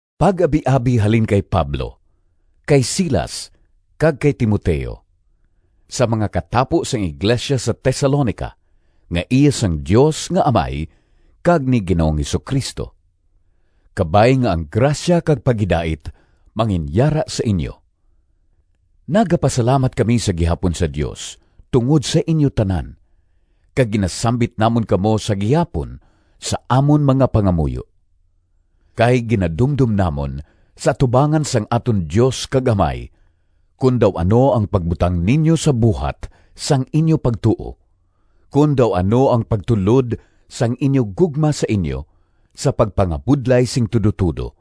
Pag-abiabi halin kay Pablo, kay Silas, kag kay Timoteo— Sa mga katapo sang iglesia sa Tesalonica, nga iya sang Dios nga Amay kag ni Ginoong Jesu-Cristo. Kabay nga ang grasya kag paghidait manginyara sa inyo. Nagapasalamat kami sa gihapon sa Dios tungod sa inyo tanan, kag ginasambit namon kamo sa gihapon sa amon mga pangamuyo. Kay ginadumdom namon sa atubangan sang aton Dios kag Amay kon daw ano ang pagbutang ninyo sa buhat sang inyo pagtuo, kon daw ano ang pagtulod sang inyo gugma sa inyo sa pagpangabudlay sing tudotudo,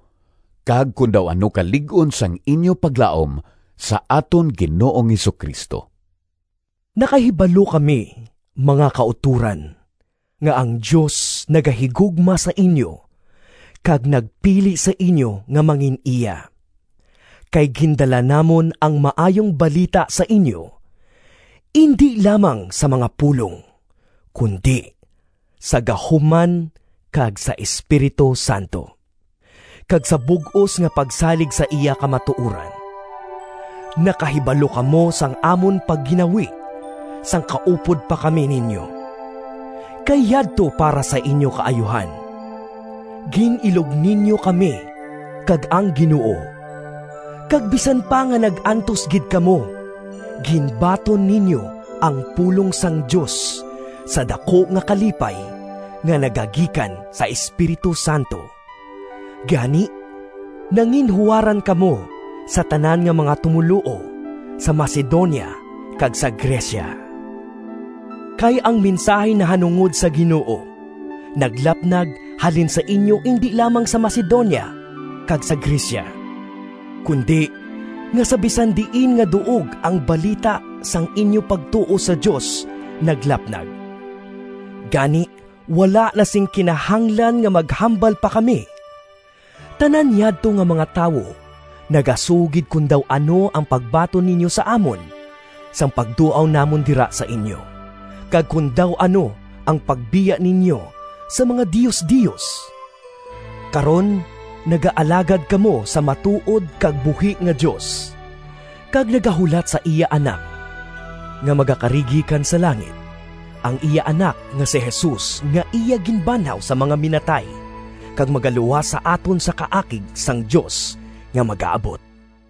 kag kon daw ano kalig-on sang inyo paglaom sa aton Ginoong Jesu-Cristo. Nakahibalo kami, mga kautoran, nga ang Dios nagahigugma sa inyo kag nagpili sa inyo nga mangin-iya. Kay gindala namon ang Maayong Balita sa inyo, indi lamang sa mga pulong, kundi sa gahom man kag sa Espiritu Santo, kag sa bug-os nga pagsalig sa iya kamatuoran. Nakahibalo kamo sang amon pagginawi sang kaupod pa kami ninyo, kay yadto para sa inyo kaayuhan. Gin-ilog ninyo kami kag ang Ginoo, kag bisan pa nga nag-antos gid kamo ginbaton ninyo ang pulong sang Dios sa daku nga kalipay nga nagagikan sa Espiritu Santo. Gani nanginhuwaran kamo sa tanan nga mga tumoluo sa Macedonia kag sa Grecia. Kay ang mensahi nahanungod sa Ginoo naglapnag halin sa inyo indi lamang sa Macedonia kag sa Grecia, kundi nga sa bisan diin nga duog ang balita sang inyo pagtuo sa Dios naglapnag. Gani wala na sing kinahanglan nga maghambal pa kami. Tanan yadto nga mga tawo nagasugid kon daw ano ang pagbaton ninyo sa amon, sang pagduaw namon dira sa inyo, kag kon daw ano ang pagbiya ninyo sa mga diosdios. Karon nagaalagad kamo sa matuod kag buhi nga Dios, kag nagahulat sa iya Anak nga magakari gikan sa langit, ang iya Anak nga si Jesus nga iya ginbanhaw sa mga minatay, kag magaluwas sa aton sa kaakig sang Dios nga magaabot.